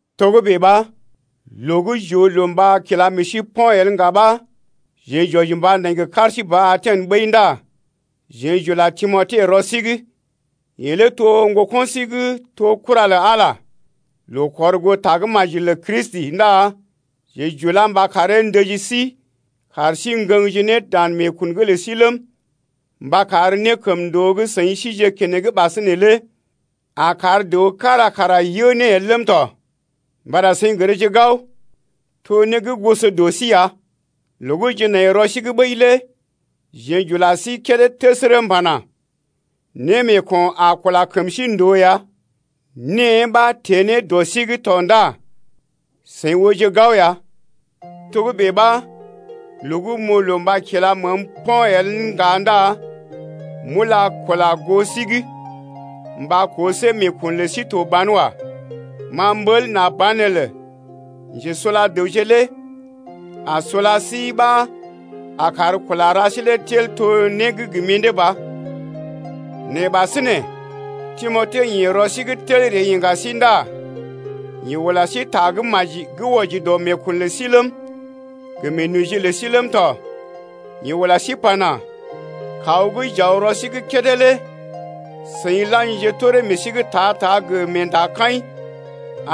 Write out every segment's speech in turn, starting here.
Togə́bè ɓa, loo gə́ j’oo loo mba kila meḛ sí po̰ el ŋga ɓa jeḛ j’wɔji mba nai gə kar sí ba Aten ɓəi ndá jeḛ j’ula Timote rɔ sí’g. Yeḛ lé to ŋgoko̰ sí gə́ to kura lə Ala loo kɔr goo Tagə́maji lə Kristi ndá jeḛ j’ulá mba karee ndəji sí kar sí ŋgəŋje ne dan meekun’g lə sí ləm, mba kar nékəmndoo gə́ seḭ sije keneŋ ɓasinè lé a kar dəw kára kara yə ne el ləm tɔ. Mbata seḭ gərje gao, to né gə́ goso dɔ sí ya. Loo gə́ jeḛ nai rɔ sí’g ɓəi lé jeḛ j’ula sí kédé təsərə m’pana: Némeeko̰ a kula kəm sí ndòo ya, née ɓa teḛ ne dɔ sí’g tɔ ndá seḭ ooje gao ya. Togə́bè ɓa, loo gə́ m’oo loo mba kila məəm po̰ el ŋga ndá m’ula kula goo sí’g mba koo see meekun lə sí to ban wa. Ma m’ɓəl nà banelə njesula dəwje lé a sula sí ɓa a kar kula ra sí lé tel to né gə́ gə mḭdé ba. Nɛ ɓasinè Timote ḭ rɔ sí’g tel ree iŋga sí ndá yeḛ ula sí ta gə́ maji gə́ wɔji dɔ meekun lə sí ləm, gə meenoji lə sí ləm tɔ. Yeḛ ula sí pana: Kaw gə́ j’aw rɔ sí’g kédé lé seḭ la̰jije toree meḛ sí’g ta-ta gə meendakaḭ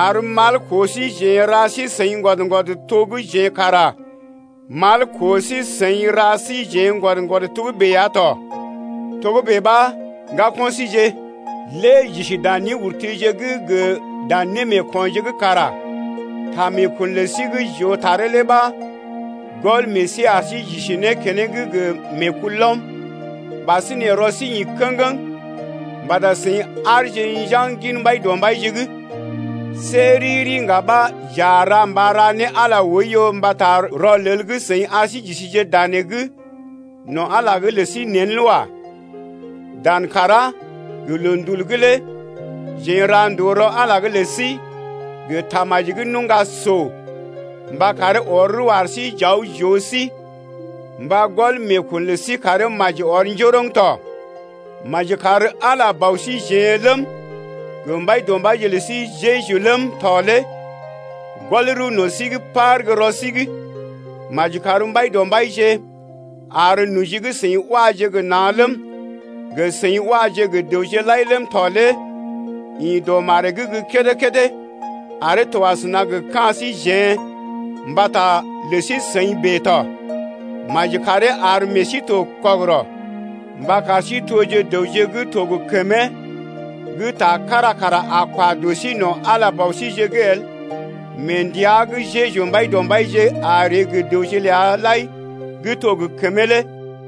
ar mal koo síjeḛ ra sí-seḭ ŋgwɔd-ŋgwɔd to gə́ jeḛ kara mal koo sí-seḭ ra síjeḛ ŋgwɔd-ŋgwɔd togə́bè ya tɔ. Togə́bè ɓa, ŋgako̰ síje, lé j’isi dan néurtije’g gə dan némeekonje’g kara ta meekun lə sí gə́ j’oo taree lé ɓa gɔl meḛ sí ar sí j’isi ne keneŋ gə meekulɔm. Ɓasinè rɔ sí ḭ kə̰geŋ mbata seḭ aarje njaŋg gin Mbaidɔmbaije’g. See riri ŋga ɓa j’a ra mba ra ne Ala oiyo mbata rɔlel gə́ seḭ ar sí j’isije danee’g no̰ Ala’g lə sí nḛ lé wa. Dan kàrá gə loondul’g lé jeḛ n’ra ndòo rɔ Ala’g lə sí gə tamaji gə́ nuŋga so mba karee ɔr rəw ar sí j’aw j’oo sí mba gɔl meekun lə sí karee maji ɔr njoroŋ tɔ. Maji kar Ala Bɔ síjeḛ ləm, gə Mbaidɔmbaije lə sí Jeju ləm tɔ lé gɔl rəw no̰ sí gə́ par gə́ rɔ sí’g. Maji kar Mbaidɔmbaije ar noji gə́ seḭ waje gə na̰ ləm, gə seḭ waje gə dəwje lai ləm tɔ lé ḭ dɔ maree’g gə́ kédé-kédé aree to asəna gə ka̰ síjeḛ mbata lə sí-seḭ bèe tɔ. Maji karee ar meḛ sí to kɔgərɔ mba kar sí toje dəwje gə́ to gə kəmee gə́ ta kára kara wa dɔ sí no̰ Ala Bɔ síje’g el mee ndəa gə́ Jeju Mbaidɔmbaije a ree gə dəwje ləa lai gə́ to gə kəmee lé.